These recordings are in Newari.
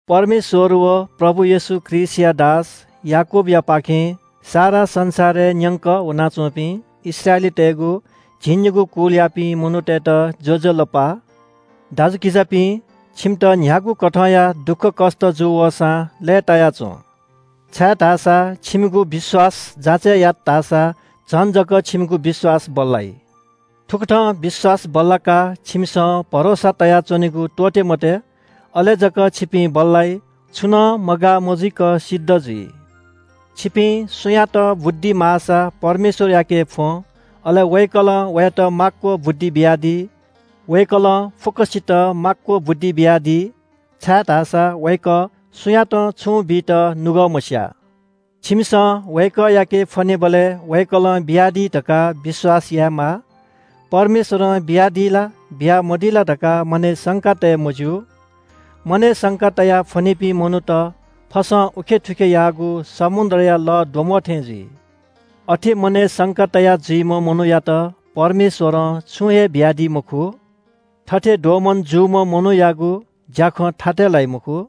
परमेश्‍वर व प्रभु येशू ख्रीष्‍टया दास याकूबयापाखें सारा संसारय् न्‍यंक वनाच्‍वंपिं इस्राएलीतय्‌गु झिंनिगू कुलयापिं मनूतय्‌त ज्‍वजलपा। दाजुकिजापिं, छिमित न्‍ह्यागु कथंया दुःखकष्‍ट जू वसां लय्‌ताया च्‍वँ। छाय्‌धाःसा छिमिगु विश्‍वास जाँचय् यात धाःसा झन जक छिमिगु विश्‍वास बल्‍लाइ। थुकथं विश्‍वास बल्‍लाकाः छिमिसं भरोसा तयाच्‍वनेगु त्‍वःते मते। अले जक छिपिं बल्‍लाइ, छुं नं मगाः मजुइक सिद्ध जुइ। छिपिं सुयातं बुद्धि माःसा परमेश्‍वरयाके फ्‍वँ, अले वय्‌कलं वयात माक्‍व बुद्धि बियादी। वय्‌कलं फुक्‍कसित माक्‍व बुद्धि बियादी, छाय्‌धाःसा वय्‌कः सुयातं छुं बीत नुगः मस्‍याः। छिमिसं वय्‌कःयाके फ्‍वनेबलय् वय्‌कलं बियादी धकाः विश्‍वास यायेमाः। परमेश्‍वरं बियादी ला बियामदी ला धकाः मनय् संका तये मज्‍यू। मनय् संका तयाः फ्‍वनीपिं मनूत फसं थुखे उखे याःगु समुद्रया लःद्वम्‍बः थें जुइ। अथे मनय् संका तया जुइम्‍ह मनूयात परमेश्‍वरं छुं हे बियादी मखु। थथे दोमन जूम्‍ह मनूयागु ज्‍याखँ थातय् लाइ मखु।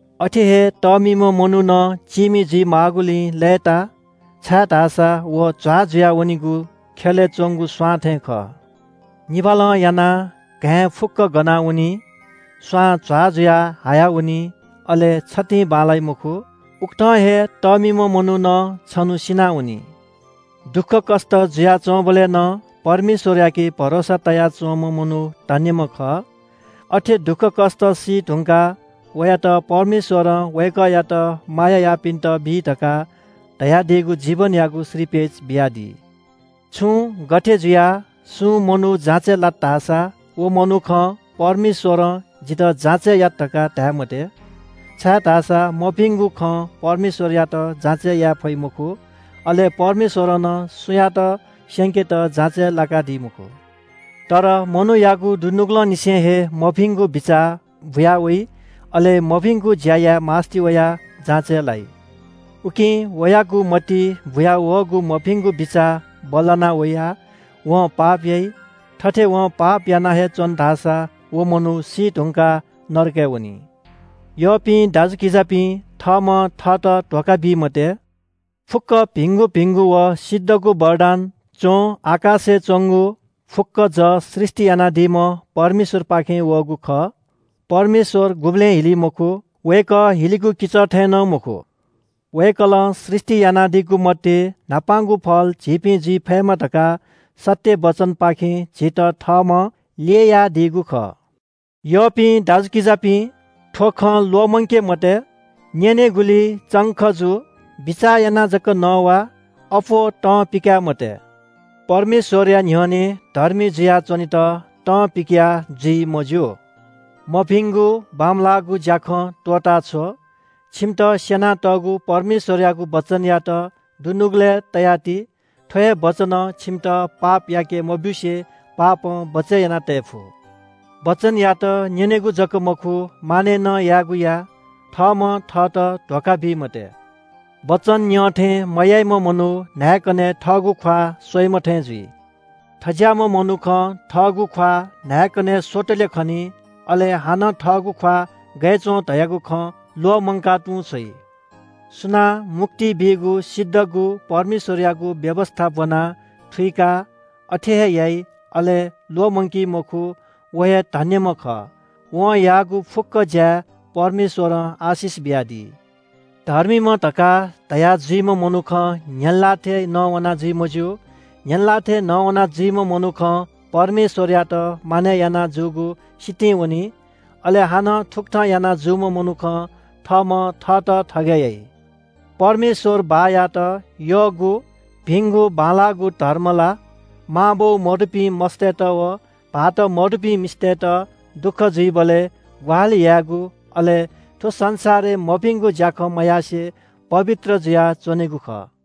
अथे हे तःमिम्‍ह मनू नं चीमि जुइमाःगुलिइ लय्‌ता छाय्‌धाःसा व झ्‍वाः जुयावनीगु ख्‍यलय् च्‍वंगु स्‍वां थें खः। निभालं यानाः घाँय् फुक्‍कं गनावनी, स्‍वां झ्‍वाः जुयाः हायावनी। अले छतिं बांलाइ मखु। उकथं हे तःमिम्‍ह मनू नं छन्‍हु सिनावनी। दुःखकष्‍ट जुयाच्‍वंबलय् नं परमेश्‍वरयाके भरोसा तयाच्‍वंम्‍ह मनू धन्‍यम्‍ह खः। अथे दुःखकष्‍ट सीधुंकाः वयात परमेश्‍वरं वय्‌कःयात माया याःपिन्‍त बी धकाः धयादीगु जीवनयागु श्रीपेच बियादी। छुं गथे जुयाः सुं मनू जाँचय् लात धाःसा व मनुखं “परमेश्‍वरं जितः जाँचय् यात” धकाः धाये मते। छाय्‌धाःसा मभिंगु खं परमेश्‍वरयात जाँचय् याये फइ मखु, अले परमेश्‍वरं नं सुयातं स्‍यंकेत जाँचय् लाकादी मखु। तर मनूयागु दुनुगलंनिसें हे मभिंगु बिचाः बुया वइ, अले मभिंगु ज्‍या याये मास्‍ति वयाः जाँचय् लाइ। उकिं वयागु मतिइ बुयावःगु मभिंगु बिचाः बल्‍लाना वयाः वं पाप याइ। थथे वं पाप याना हे च्‍वन धाःसा व मनू सीधुंकाः नरकय् वनी। यःपिं दाजुकिजापिं, थःम्‍हं थःत धोखा बी मते। फुक्‍क भिंगु भिंगु व सिद्धगु वरदान च्‍वं, आकाशय् च्‍वंगु फुक्‍क जः सृष्‍टि यानादीम्‍ह परमेश्‍वरपाखें वःगु खः। परमेश्‍वर गुबलें हिली मखु, वय्‌कः हिलिगु किचः थें नं मखु। वय्‌कलं सृष्‍टि यानादीगु मध्‍ये न्‍हापांगु फल झीपिं जुइ फयेमा धकाः सत्‍य वचनपाखें झीत थःम्‍हं ल्‍ययादीगु खः। यःपिं दाजुकिजापिं, थ्‍व खँ ल्‍वःमंके मते – न्‍यनेगुलिइ चंख जु। बिचाः यानाः जक नवा, अप्‍वः तं पिकाये मते। परमेश्‍वरया न्‍ह्यःने धर्मी जुया च्‍वनेत तं पिकया जुइ मज्‍यू। मभिंगु बांमलाःगु ज्‍याखँ त्‍वःताछ्व। छिमित स्‍यनातःगु परमेश्‍वरयागु वचनयात दुनुगलय् तयाति। थ्‍व हे वचनं छिमित पाप याके मब्‍यूसे पापं बचय् यानातये फु। वचनयात न्‍यनेगु जक मखु, मानय् नं यायेगु या। थःम्‍हं थःत धोखा बी मते। वचन न्‍यं थें मयाइम्‍ह मनू न्‍हाय्‌कनय् थःगु ख्‍वाः स्‍वइम्‍ह थें जुइ। थज्‍याःम्‍ह मनुखं थःगु ख्‍वाः न्‍हाय्‌कनय् स्‍वतले खनी। अले हानं थःगु ख्‍वाः गय् च्‍वं धयागु खँ ल्‍वःमंका तुं छ्वइ। सुनां मुक्ति बीगु सिद्धगु परमेश्‍वरयागु व्‍यवस्‍था ब्‍वनाः थुइकाः अथे हे याइ, अले ल्‍वःमंकी मखु, व हे धन्‍यम्‍ह खः। वं याःगु फुक्‍क ज्‍याय् परमेश्‍वरं आशिष बियादी। धर्मीम्‍ह धकाः धया जुइम्‍ह मनुखं न्‍ह्यःने लाः थें नवाना जुइ मज्‍यू। न्‍ह्यःने लाः थें नवाना जुइम्‍ह मनुखं परमेश्‍वरयात मानय् याना जूगु सितिं वनी। अले हानं थुकथं याना जूम्‍ह मनुखं थःम्‍हं थःत थगय् याइ। परमेश्‍वर बाःयात यःगु भिंगु बांलाःगु धर्म ला मांबौ मदुपिं मस्‍तय्‌त व भाःत मदय्‌ धुंकूपिं मिसातय्‌त दुःख जुइबलय् ग्‍वाहालि यायेगु, अले थ्‍व संसारय् मभिंगु ज्‍याखँ मयासें पवित्र जुयाच्‍वनेगु खः।